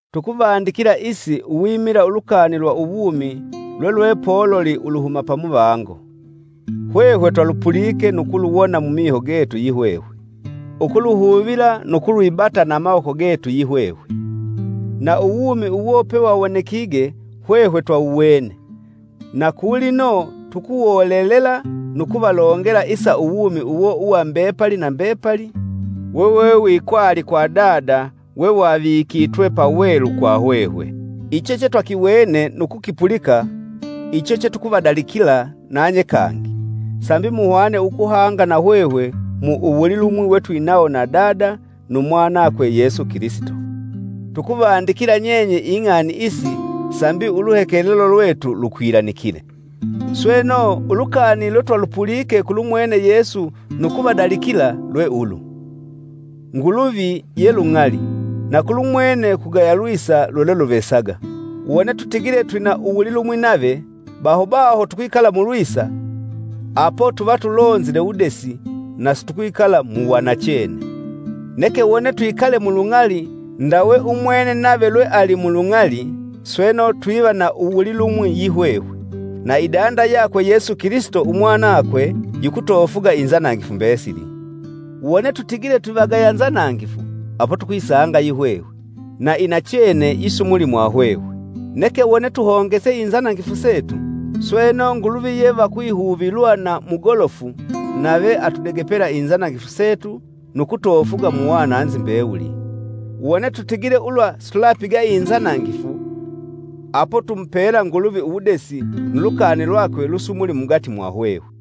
Tukuvandikila isi uwimila ulukani lwa uwumi lwelwepoluli uluhuma pamuvango. Hwehwe twalupulike nu kuluwona mumiho getu yihwehwe, ukuluhuvila nu kulwibata na amawoko getu yihwehwe. Na uwumi uwo pewawonekige hwehwe twawuwene na kulino tukuwolelela nu kuvalongela isa uwumi uwo wa mbepali na mbepali wewewikwali kwa Dada wewavikitwe pawelu kwa hwehwe. Icho chetwakiwene nu kukipulika icho chetukuvadalikila nanye kangi, sambi muhwane ukuhanga nahwehwe mu uwulilumwi wetwinawo na Dada nu mwanakwe Yesu Kilisito. Tukuvandikila nyenye ing'ani isi sambi uluhekelelo lwetu lukwilanikile. Sweno, ulukani lwetwalupulike kulumwene Yesu nu kuvadalikila lwe ulu: Nguluvi ye lung'ali, na kulumwene kugaya lwisa lwelweluvesaga. Wone tutigile twina uwulilumwi nave, baho baho tukwikala mulwisa, apo tuva tulonzile wudesi na situkwikala mu wanachene. Neke wone twikale mu lung'ali, ndawe umwene nave lweali mulung'ali, sweno, twiva na uwulilumwi yihwehwe, na idanda yakwe Yesu Kilisito umwanakwe, yikutofuga inzanangifu mbesili. Wone tutigile twivagaya nzanangifu, apo tukwisanga yihwehwe, na inachene yisumuli mwahwehwe. Neke wone tuhongese inzanangifu setu, sweno, Nguluvi ye va kwihuvilwa na mugolofu, nave atudegepela inzanangifu setu nu kutofuga mu wananzi mbewuli. Wone tutigile ulwa situlapiga inzanangifu, apo tumupela Nguluvi uwudesi, nu lukani lwakwe lusumuli mugati mwahwehwe.